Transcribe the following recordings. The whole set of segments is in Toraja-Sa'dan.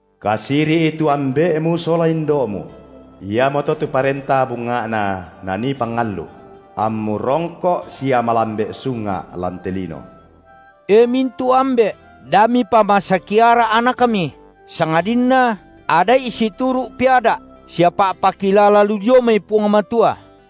Kasiri’i tu ambe’mu sola indo’mu – iamoto tu parenta bunga’na nanii pangallu’, – ammu rongko’ sia malambe’ sunga’ lan te lino. E mintu’ ambe’, da mipamasaki ara’ anakmi, sangadinna ada’i situru’ peada’ sia pa’pakilala lu dio mai Puang Matua.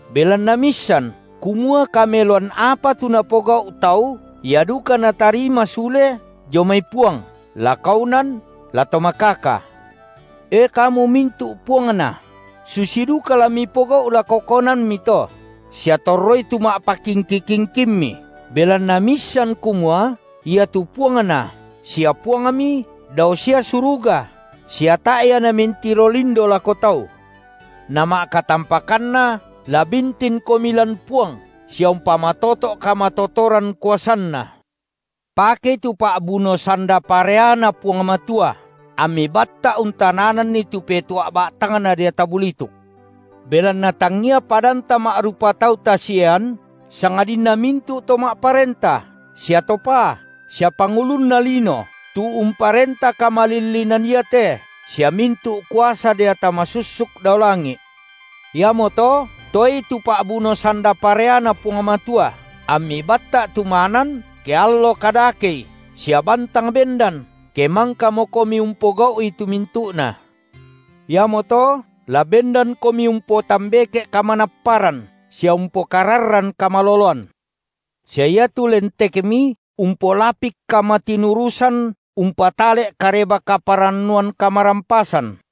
belanna miissan, kumua kameloan apa tu napogau’ tau, ia duka natarima sule dio mai Puang, la kaunan, la to makaka. E kamu mintu’ puangna, susi duka la mipogau’ lako kaunanmi to, sia torroi tu pa’pakingki-kingkimmi, belanna miissan kumua iatu Puangna sia Puangmi dao sia suruga sia tae’ Ia Namentiro lindo lako tau. Nama’katampakanna la bintinkomi lan Puang sia umpomatoto’ kamatotoran kuasanNa. Pakei tu pa’buno sanda pareaNa Puang Matua, ammi batta’ untanananni tu petua’ ba’tangna deata bulituk. Belanna tangia padanta ma’rupa tau tasiean, sangadinna mintu’ to ma’parenta sia to paa sia pangulunna lino tu umparenta kamalillinan iate sia mintu’ kuasa deata masussuk dao langi’. Iamoto, toei tu pa’buno sanda pareaNa Puang Matua, ammi batta’ tumanan, ke allo kadakei sia bantang bendan, ke mangkakomi umpogau’i tu mintu’na. Iamoto la bendankomi umpotambeke’ kamanapparan sia umpokararran kamaloloan, sia iatu lentekmi umpolapik kamatinurusan umpatale’ Kareba-kaparannuan kamarampasan,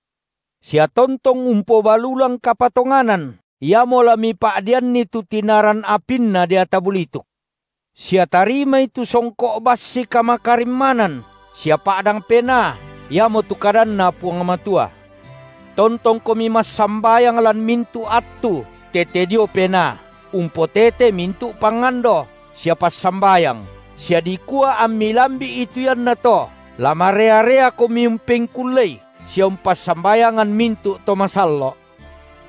sia tontong umpobalulang kapatonganan, iamo la mipa’deanni tu tinaran apinna deata bulituk. Sia tarimai tu songko’ bassi kamakarimmanan sia pa’dang Penaa, iamotu kadanNa Puang Matua. Tontongkomi massambayang lan mintu’ attu tete dio Penaa, umpotete mintu’ pangando sia passambayang, sia dikua ammi lambi’i tu iannato, la marea-reakomi umpengkullei sia umpassambayangan mintu’ to masallo’,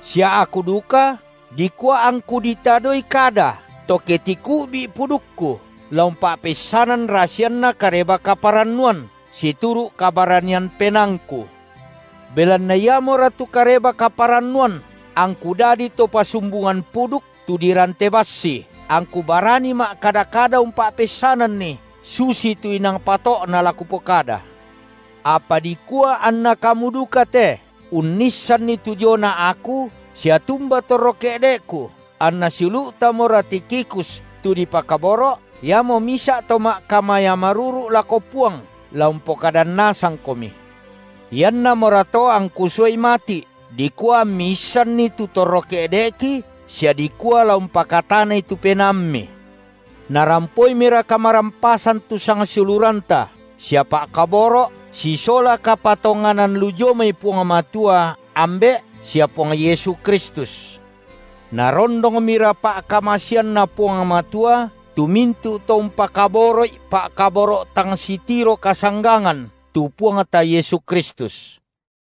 sia aku duka, dikua angku ditadoi kada to ke tiku’bi’i pudukku, la umpa’peissanan rasianna Kareba-kaparannuan situru’ kabaranian pena- angku. Belanna iamora tu Kareba-kaparannuan angku dadi to pasumbungan puduk tu dirante bassi, angku barani ma’kada-kada umpa’peissananni, susitu inang pato’na la kupokada. Apa dikua anna kamu duka te unnissanni tu diona aku sia tumbai torro ke’de’ku, anna siulu’tamora Tikhikus tu dipakaboro’, iamo misa’ to ma’kamaya maruru’ lako Puang, la umpokadan nasangkomi. Iannamora to angku suai mati’ dikua ammi issanni tu torro ke’de’ki sia dikua la umpakatanai tu penaammi. Narampoimira kamarampasan tu sangsiuluranta sia pa’kaboro’ sisola kapatonganan lu dio mai Puang Matua, Ambe’, sia Puang Yesu Kristus. Narondongmira pa’kamaseanNa Puang Matua tu mintu’ to umpakaboro’i pa’kaboro’ tang sitiro kasanggangan tu Puangta Yesu Kristus.